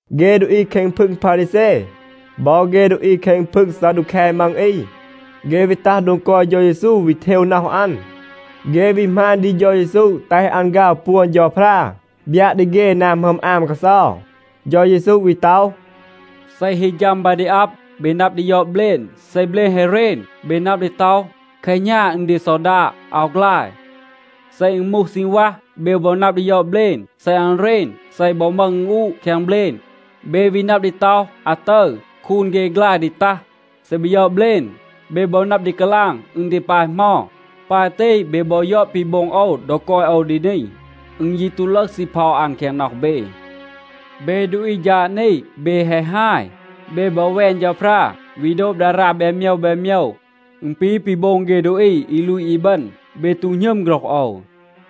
เฆ ดูอี แคง พึง พารีแซ บอ เฆ ดูอี แคง พึง ซาดูแค มัง อี, เฆ วี ตัห โดง กอย เฌา เยซู, วี เทว น็อห อัน. เฆ วี หมาณ ดี เฌา เยซู แตห อัน ฆาว ปวน เฌาพรา, บยัะ ดี เฆ นา หมึอม อาม กาเซา. เฌา เยซู วี ต็อห, “เซ ฮี ฌัม บา ดี อับ เบ นับ ดี ยอด เบลณ. เซ เบลณ แฮะ เรณ, เบ นับ ดี ต็อห, ‘แคหณา อึณ ดี ซอดาด, อาว ฆลาย.’ เซ อึณ มูห ซีณวัห, เบ บอ นับ ดี ยอด เบลณ. เซ อัน เรณ, เซ อึณ บอ มึห อึณอูะ แคง เบลณ, เบ วี นับ ดี ต็อห, ‘อาตึร คูน เฆ ฆลาย ดี ตัห.’ เซ เบ ยอด เบลณ, เบ บอ นับ ดี กาลาง อึณ ดี ปาย เหมา. ปาย ตี, เบ บอ ยอด ปี โบง โอว ดอ กอย โอว ดี นี. อึณ ยี ตู ลึห ซีเพา อัน แคง น็อห เบ. เบ ดูอี ฌาด นี, เบ แฮะ ฮาย. เบ บอ แวน เฌาพรา, วี โดบ ดารา แบน โมยว แบน โมยว. อึณ ปี ปี โบง เฆ ดูอี อี ลูต อีบึณ. เบ ตู หณึม โฆรห โอว,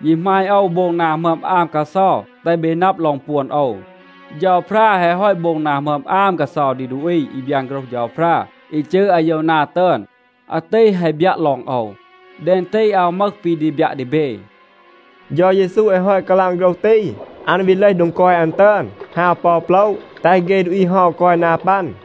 ยี หมาณ โอว โบง นา หมึอม อาม กาเซา แตห เบ นับ ลอง ปวน โอว. เฌาพรา แฮะ ฮอต โบง นา หมึอม อาม กาเซา ดี ดูอี อี บยาน โฆรห เฌาพรา อี จืร อาโยวนา ตึอน. อาตี แฮะ บยัะ ลอง โอว. แดง ตี อาว มึห ปี ดี บยัะ ดี เบ.” เฌา เยซู แฮะ ฮอต กาลาง โฆรห ตี, อัน วี เลห โดง กอย อัน ตึอน, ฮาว ปอ อู โปละ แตห เฆ ดูอี เฮา กอย นา ปัน.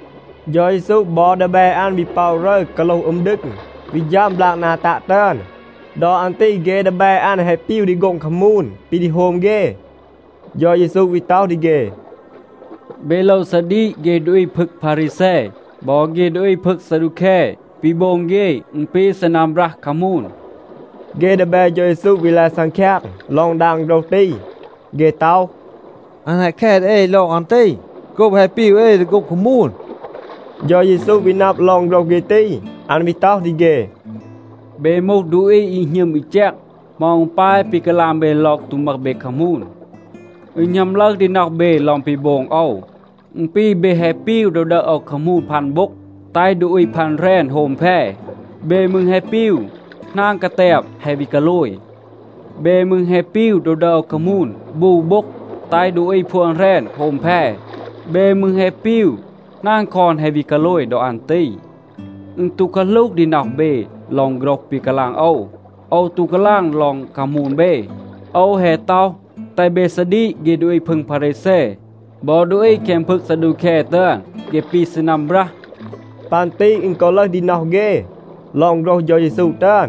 เฌา เยซู บอ ดีแบ อัน วี ป็อะ รึร, กาโลห อึม ดึง, วี ฌัม บลาก นา ตัะ ตึอน. ดอ อัน ตี เฆ ดีแบ อัน แฮะ ปีว ดี โฆ็ง คามูน ปี ดี โฮม เฆ. เฌา เยซู วี ต็อห ดี เฆ, “เบ โลว ซาดีก เฆ ดูอี พึง พารีแซ บอ เฆ ดูอี พึง ซาดูแค. ปี โบง เฆ, อึณ ปี ซีนัม บรัห คามูน.” เฆ ดีแบ เฌา เยซู วี ลาย ซังคยาง ลอง ดาง โฆรห ตี. เฆ ต็อห, “อัน แฮะ แค ดี เอ ลอง อัน ตี โกบ แฮะ ปีว เอ ดี โฆ็ง คามูน.” เฌา เยซู วี นับ ลอง โฆรห เฆ ตี, อัน วี ต็อห ดี เฆ, “เบ มูห ดูอี อี หณึม อี แจก. เหมา อึณ ปาย ปี กาลาง เบ ลอง ตู มึห เบ คามูน? อึณ หณัม ลึห ดี น็อห เบ ลอง ปี โบง โอว. อึณ ปี, เบ แฮะ ปีว ดอ ดึห โอว คามูน พัน โบ็ง, แตห ดูอี พัน แหรณ โฮม แพ. เบ มืร แฮะ ปีว, หนาง กาแตบ แฮะ วี กาโลย. เบ มืร แฮะ ปีว ดอ ดึห โอว คามูน บู โบ็ง, แตห ดูอี พวน แหรณ โฮม แพ. เบ มืร แฮะ ปีว หนาง คอน แฮะ วี กาโลย ดอ อัน ตี. อึณ ตู กาหลูห ดี น็อห เบ ลอง โฆรห ปี กาลาง โอว. โอว ตู กาลาง ลอง คามูน เบ. โอว แฮะ ต็อห, แตห เบ ซาดีก เฆ ดูอี พึง พารีแซ บอ ดูอี แคง พึง ซาดูแค ตึอน. เฆ ปี ซีนัม บรัห.” ปัน ตี อึณ กอ ลึห ดี น็อห เฆ ลอง โฆรห เฌา เยซู ตึอน.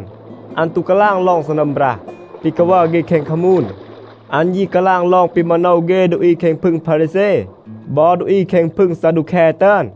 อัน ตู กาลาง ลอง ซีนัม บรัห ปี กาวัร เฆ แคง คามูน. อัน ยี กาลาง ลอง ปี มาโนว เฆ ดูอี แคง พึง พารีแซ บอ ดูอี แคง พึง ซาดูแค ตึอน.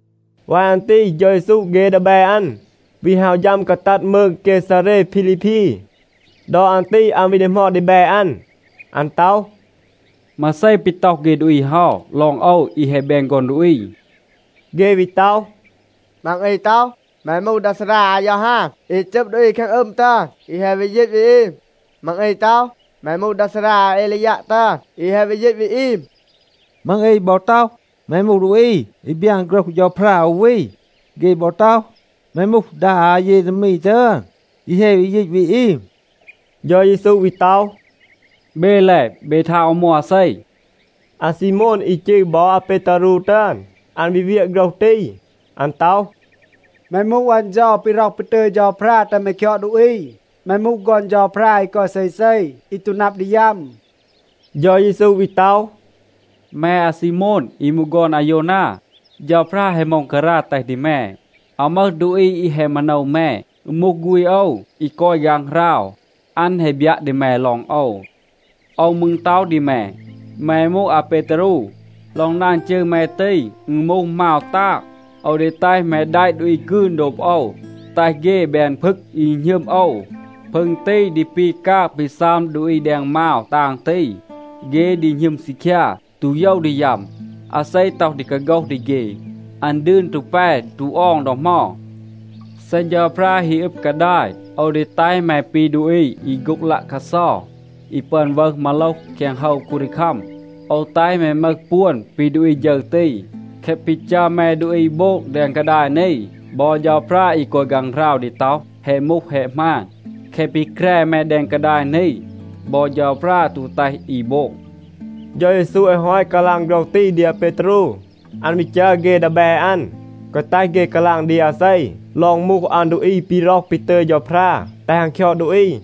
วาย อัน ตี เฌา เยซู เฆ ดีแบ อัน วี ฮาว ฌัม กาตัด มืง เกซาเร พีลีพี. ดอ อัน ตี อัน วี ดีหมอด ดีแบ อัน. อัน ต็อห, “มาเซ ปี ต็อห เฆ ดูอี เฮา, ลอง โอว อี แฮะ แบน ฆอน ดูอี?” เฆ วี ต็อห, “มัง อี ต็อห, แม มูห ดา ซารา อายอฮาน อี จึบ ดูอี แคง อึม ตึอน อี แฮะ วี ยีต วี อีม. มัง อี ต็อห, แม มูห ดา ซารา อาเอลียัะ ตึอน อี แฮะ วี ยีต วี อีม. มัง อี บอ ต็อห, แม มูห ดูอี อี บยาน โฆรห เฌาพรา อู วี. เฆ บอ ต็อห, แม มูห ดา อาเยเรมี ตึอน อี แฮะ วี ยีต วี อีม.” เฌา เยซู วี ต็อห, “เบ แล, เบ ทาง, โอว มูห อาเซ?” อาซีโมน อี จืร บอ อาเปตารู ตึอน, อัน วี เวียะ โฆรห ตี. อัน ต็อห, “แม มูห อัน เฌา ปี ร็อห ปี ตึย เฌาพรา แตห แม คยอด ดูอี. แม มูห ฆอน เฌาพรา อี กอย เซเซ, อี ตู นับ ดี ยัม.” เฌา เยซู วี ต็อห, “แม อาซีโมนa อี มูห ฆอน อาโยวนา, เฌาพรา แฮะ ม็องการา แตห ดี แม. อาว มึห ดูอี อี แฮะ มาโนว แม. อึณ มูห ฆูณ โอว, อี กอย ฆางหราว, อัน แฮะ บยัะ ดี แม ลอง โอว. โอว มืร ต็อห ดี แม, แม มูห อาเปตารู. ลอง ดาง จืร แม ตี, อึณ มูห มาว ตาง. โอว ดี แตห แม แดะ ดูอี กืน โดบ โอว, แตห เฆ แบน พึง อี หณึม โอว. พึง ตี ดี ปี กาง ปี ซัม ดูอี แดง มาว ตาง ตี. เฆ ดี หณึม ซีคยา, ตู โยว ดี ยัม. อาเซ ต็อห ดี กาโฆห ดี เฆ, อัน ดืน ตู แป ตู ออง ดอ เหมา. เซ เฌาพรา ฮี อึบ กาดาย, โอว ดี แตห แม ปี ดูอี อี โฆ็ง ลัะคัดเซา อี ปึอน วึห มาโลห แคง โฮว คูนดีคัม. โอว แตห แม มึห ปวน ปี ดูอี ฌึร ตี. แคะ ปี จัร แม ดูอี โบง แดง กาดาย นี, บอ เฌาพรา อี กอย ฆางหราว ดี ต็อห, แฮะ มูห, แฮะ หมาน. แคะ ปี แคร แม แดง กาดาย นี, บอ เฌาพรา ตู แตห อี โบง.” เฌา เยซู แฮะ ฮอต กาลาง โฆรห ตี ดี อาเปตารู, อัน วี จัร เฆ ดีแบ อัน, แกวะ แตห เฆ กาลาง ดี อาเซ ลอง มูห อัน ดูอี ปี ร็อห ปี ตึย เฌาพรา แตห อัน คยอด ดูอี.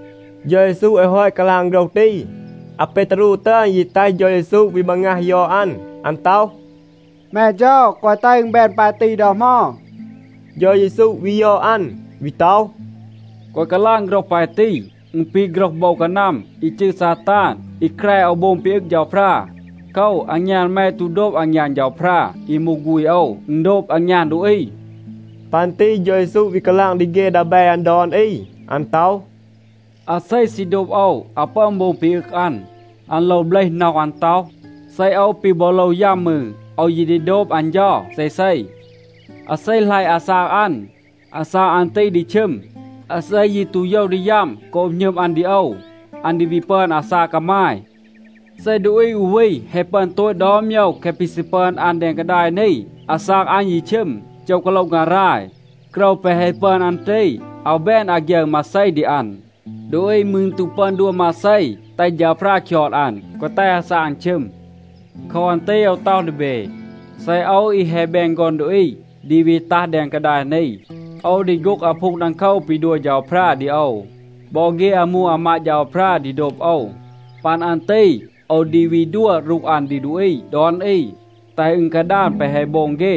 เฌา เยซู แฮะ ฮอต กาลาง โฆรห ตี, อาเปตารู ตึอน ยี แตห เฌา เยซู วี มางัห ยอด อัน. อัน ต็อห, “แม เฌา, แกวะ แตห อึณ แบน ปาย ตี ดอ เหมา.” เฌา เยซู วี ยอด อัน, วี ต็อห, “แกวะ กาลาง โฆรห ปาย ตี. อึณ ปี โฆรห โบว กานัม อี จืร ซาตาน อี แคร โอว โบง ปี อึง เฌาพรา. โคว, อางยาน แม ตู โดบ อางยาน เฌาพรา อี มูห ฆูณ โอว. อึณ โดบ อางยาน ดูอี.” ปัน ตี เฌา เยซู วี กาลาง ดี เฆ ดีแบ อัน ดอน อี. อัน ต็อห, “อาเซ ซี โดบ โอว อาว ปึอน โบง ปี อึง อัน. อัน โลว เบลห น็อห อัน ต็อห, ‘เซ โอว ปี บอ โลว ยัม มืร, โอว ยี ดี โดบ อัน เฌา เซเซ.’ อาเซ หลัยะ อาซาก อัน, อาซาก อัน ตี ดี ชึม. อาเซ ยี ตู โยว ดี ยัม โกบ หณึม อัน ดี โอว, อัน ดี วี ปึอน อาซาก กามาย. เซ ดูอี อู วี แฮะ ปึอน โตต ดอน โมยว แคะ ปี ซี ปึอน อัน แดง กาดาย นี, อาซาก อัน ยี ชึม, โจห กาโละ งาราย, โกรว แปะ แฮะ ปึอน อัน ตี, อาว แบน อาฆยึร มาเซ ดี อัน. ดูอี มืร ตู ปึอน ดัว มาเซ, แตห เฌาพรา คยอด อัน, แกวะ แตห อาซาก อัน ชึม. โคว อัน ตี โอว ต็อห ดี เบ, เซ โอว อี แฮะ แบน ฆอน ดูอี ดี วี ตัห แดง กาดาย นี, โอว ดี โฆ็ง อาพูง ดังโคว ปี ดัว เฌาพรา ดี โอว. บอ เฆ อามู อามาด เฌาพรา ดี โดบ โอว. ปัน อัน ตี, โอว ดี วี ดัว รูห อัน ดี ดูอี ดอน อี, แตห อึณ กาดาน แปะ แฮะ โบง เฆ.